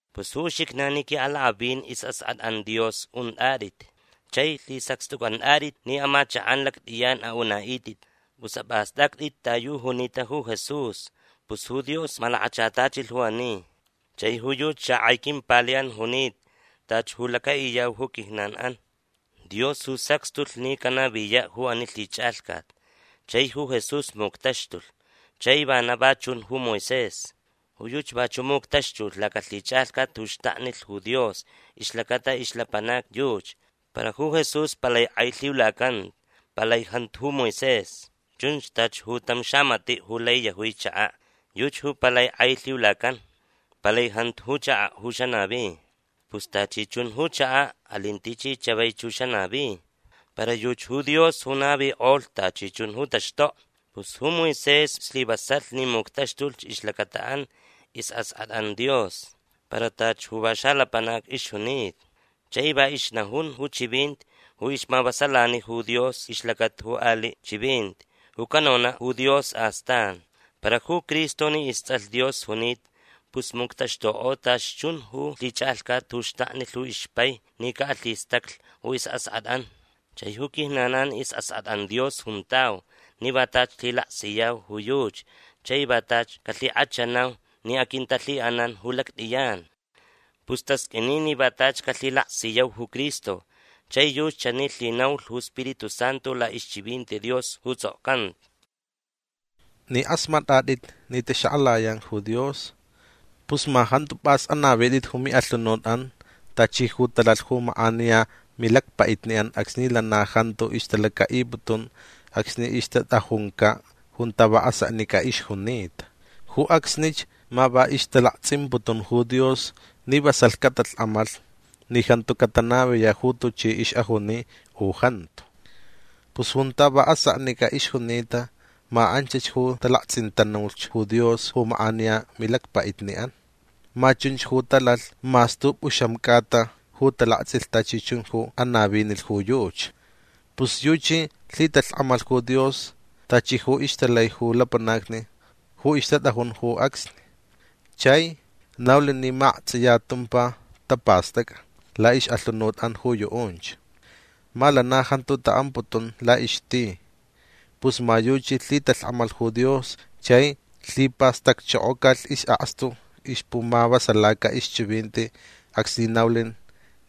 Pus ju uxijnan ji qui'alak'avin is'ask'at'an Dios unt'at'it chai lhisacxt'uc'ant'at'it ni amachak'an lact'iyan a'una'it'it. Pus ap'ast'act'it ta yu junita ju Jesús. Pus ju Dios malakachatachilh ju ani. Chai ju yuchi xak'ai quimpali'an junita tachi ju laca'iyau ju quijnan'an. Dios ju sacxtulh ni canaviya' ju ani lhich'alhcat. Chai ju Jesús muctaxtulh. Chai vana va chun ju Moisés. Ju yuchi vachu' muctaxtulh lacalhich'alhcat ju xtaknilh ju Dios ixlacata ixlapanacni yuchi. Para ju Jesús palai k'ai lhiulacanta. Palai jantu ju Moisés. Chun tachi ju tam xamati' ju lai yajui chaka'. Yuchi ju palai k'ai lhiulacan. Palai jantu ju chaka' ju xanavi. Pus tachi chun ju chaka' alin tichi chavaich ju xanavi. Para yuchi ju Dios ju navik'olh tachi chun ju taxtokni. Pus ju Moisés slivasalh ni muctaxtulh ixlacata'an is'ask'at'an Dios. Para tachi ju va xalapanac ixjunita. Chai va ixnajun ju chivinti ju ixmavasalani ju Dios ixlacata ju ali' chivinti ju canona' ju Dios astan. Para ju Cristo ni ists'alh Dios junita pus muctaxtuk'o tachi chun ju lhich'alhcat ju xtaknilh ju ixpai ni ca'alhistaclh ju is'ask'at'an. Chai ju quijnan'an is'ask'at'an Dios juntau ni va tachi lhilaksiyau ju yuchi chai va tachi calhik'achanau ni aquintalhi'anan ju lact'iyan. Pus tasq'uini ni va tachi calhilaksiyau ju Cristo. Chai yuchi chani lhinaulh ju Spiritu Santu la'ixchivinti Dios ju ts'okcanta: Ni k'asmat'at'it ni taxak'alayan ju Dios pus ma jantu p'as anavit'it ju mi'alhunut'an tachi ju talalh ju mak'aniya milacpa'itni'an acsni lana jantu ixtalaca'iputun acsni ixtat'ajunca' junta va aseknic'a ixjunita. Ju acsnich ma va ixtalakts'imputun ju Dios ni vasalh catalhk'amalh ni jantu catanaviya' ju tuchi ix'ajuni u jantu. Pus junta va aseknic'a ixjunita ma anchach ju talakts'intanulh ju Dios ju mak'aniya milacpa'itni'an. Ma chunch ju talalh mas t'up'uxam c'ata ju talakts'ilh tachi chun ju anavinilh ju yuchi. Pus yuchi lhitalhk'amalh ju Dios tachi ju ixtalai ju lapanacni ju ixtat'ajun ju acsni. Chai naulh ni ma akts'iya tumpa tapast'ac'a la'ix'alhunut'an ju yu'unch. Ma lana jantu ta'amputun la'ixti. Pus ma yuchi lhitalhk'amalh ju Dios chai lhipastacchokocalh is'akstu ixpumavasalaca ixchivinti acsni naulh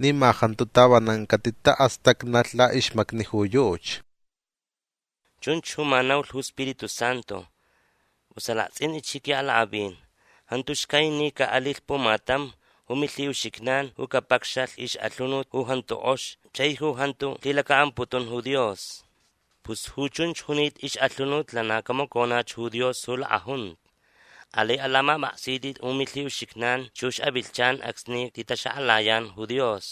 ni ma jantu tavanan catita'astacnalh la'ixmacni ju yuchi. Chunch ju ma naulh ju Spiritu Santu. Pus alakts'int'itch ji qui'alak'avin. Jantu xcai ni ca'alilh pumatam ju milhi'uxijnan ju capacxalh ix'alhunut ju jantu k'ox chai ju jantu lhilaca'amputun ju Dios. Pus ju chunch junita ix'alhunut lana camaconach ju Dios ju lak'ajunta. Alai alamap'aksit'it ju milhi'uxijnan chux avilhchan acsni titaxak'alayan ju Dios.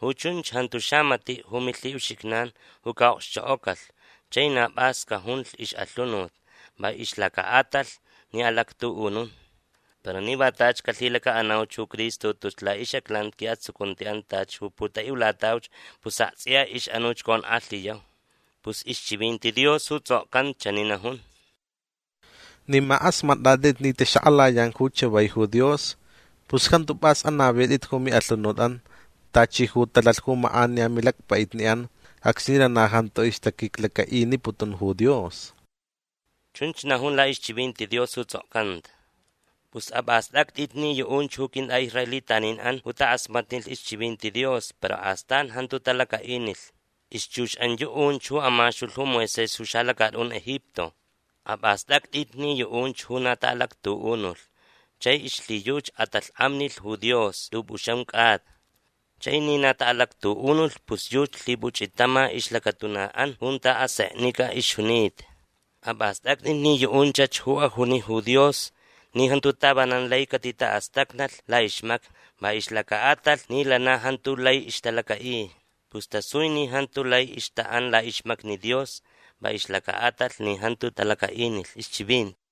Ju chunch jantu xamati' ju milhi'uxijnan ju ca'okxchok'ocalh chai na p'as cajunlh ix'alhunut va ixlaca'atalh ni alactu'unun. Para ni va tachi calhilaca'anauch ju Cristo tus la'ix'aclanti qui'atsucunti'an tachi ju putai'ulatauch pus akts'iya ix'anuch conk'alhiyau. Pus ixchivinti Dios ju ts'okcanta chani najun: Ni ma k'asmat'at'it ni taxak'alayan ju chavai ju Dios pus jantu p'as anavit'it ju mi'alhunut'an tachi ju talalh ju mak'aniya milacpa'itni'an acsni lana jantu ixtaquiclaca'iniputun ju Dios. Chunch najun la'ixchivinti Dios ju ts'okcanta. Pus ap'ast'act'it ni yu'unch ju quint'a'israelitanin'an ju tak'asmatnilh ixchivinti Dios para astan jantu talaca'inilh. Ixchux'an yu'unch ju amaxtulh ju Moisés ju xalacat'un Egipto. Ap'ast'act'it ni yu'unch ju na ta'alactu'unulh chai ixlhiyuchi at'alhk'amnilh ju Dios t'up'uxam c'ata. Chai ni na ta'alactu'unulh pus yuchi lhip'uch'itama ixlacatuna'an junta aseknic'a ixjunita. Ap'ast'act'it ni yu'unchach ju ajuni ju Dios ni jantu tavanan lai catita'astacnalh la'ixmacni va ixlaca'atalh ni lana jantu lai ixtalaca'i. Pus tasui ni jantu lai ixta'an la'ixmacni Dios va ixlaca'atalh ni jantu talaca'inilh ixchivinti.